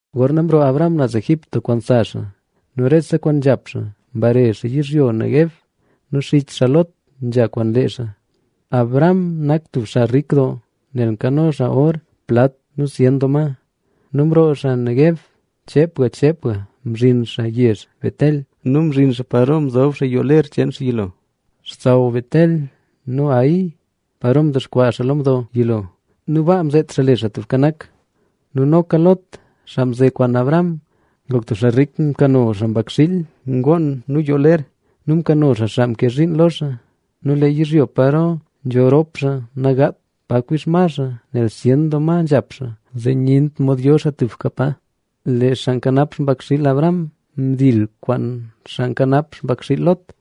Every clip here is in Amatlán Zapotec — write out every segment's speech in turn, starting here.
Gorna mroo Abram naz Egipto kwaan sa xaa nu rese kwaan nzhap xaa, mbare xaa yizhyo Neguev. Nu xich xaa Lot nzha kwaan lee xaa. Abram nak tub xaa rik doo nel nkano xaa or, plat nu zyen doo ma. Nu mroo xaa Neguev, cheepga cheepga mzhin xaa yezh Betel nu mzhin xaa paro mzob xaa yoo ler cheen xaa yilo, xsaw Betel nu Hai, paro mdexkwaa xaa lo mdo yilo nu baa mzeet xaa le Xaa Tubka Nak. Nu noka Lot, xaa mze kwaan Abram ngok tub xaa rik. Mkano xaa mbakxiil, ngoon nu yoo ler nu mkano xaa xaa mke zhiin lo xaa. Nu lee yizhyo paro nzho rop xaa nagaat pa kwii xma xaa nel zyen doo ma nzhap xaa, zee nyent mod yo xaa tuka pa. Lee xaa nkanap xpakxiil Abram mdil xaa kwaan xaa nkanap xpakxiil Lot.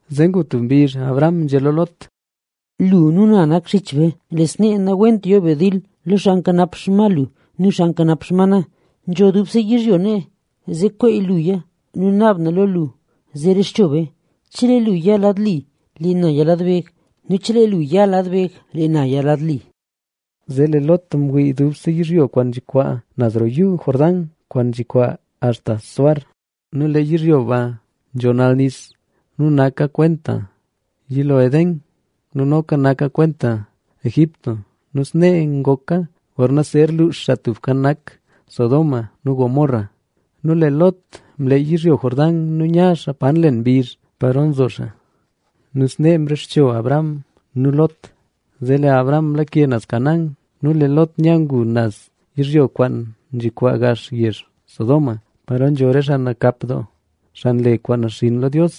Zee ngu tub mbizh Abram nzhé lo Lot: —Lu nu na nak xich be. Nawent yo be dil lo xaa nkanap xma lu nu xaa nkanap xma na. Nzho dubse yizhyo nee, zee kwey luya nu naab na lo lu zee rexcho be. Chelee lu ya lad li, lee na ya lad beg nu chelee lu ya lu lad beg, lee na ya lad li. Zee lee Lot ngwii dubse yizhyo kwaan nzhikwaa naz roo Yuu Jordán, kwaan nzhin axta Zoar. Nu lee yizhyo ba nzho nal nis nu nak kwent yilo Edén. Nu noka naka kwenta Egipto nu snee ngoka gorna zer luux Xaa Tubka Nak Sodoma nu Gomorra. Nu lee Lot mleey yizhyo Jordán nu nya xaa pa nlen mbizh paro nzo xaa. Nu snee mrexcho Abram nu Lot. Zee lee Abram mlake naz Canaán nu lee Lot nya ngu naz yizhyo kwaan nzhikwaa gax yezh Sodoma, paro nzho re xaa nakap doo, xaa nle kwaan naxinn lo Dios.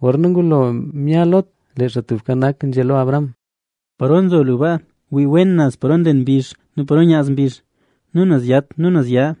Gorna ngulo mya Lot, lee Xaa Tubka Nak nzhé lo Abram: —Paro nzo lu baa, wii wen naz paro nlen mbizh nu paro nyaz mbizh nu naz yat nu naz ya.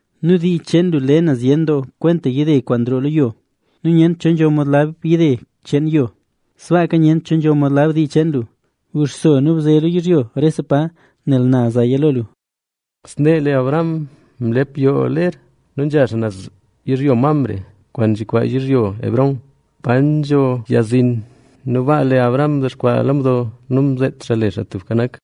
Nu dii cheen lu le na zyen doo kwenta yide kwaan nroo lo yo; nu nyent cho nzho mod lab yide cheen yo, sbaaka nyent cho nzho mod lab dii cheen lu. Guxso nu bze lo yizhyo rese pa, nel na zaya lo lu. Snee lee Abram mlep yoo ler nu nzha naz yizhyo Mamre, kwaan nzhikwaa yizhyo Hebrón, pa nzho yag zin. Nu baa lee Abram mdexkwaa lo mdo nu mzeet xaa le Xaa Tubka Nak.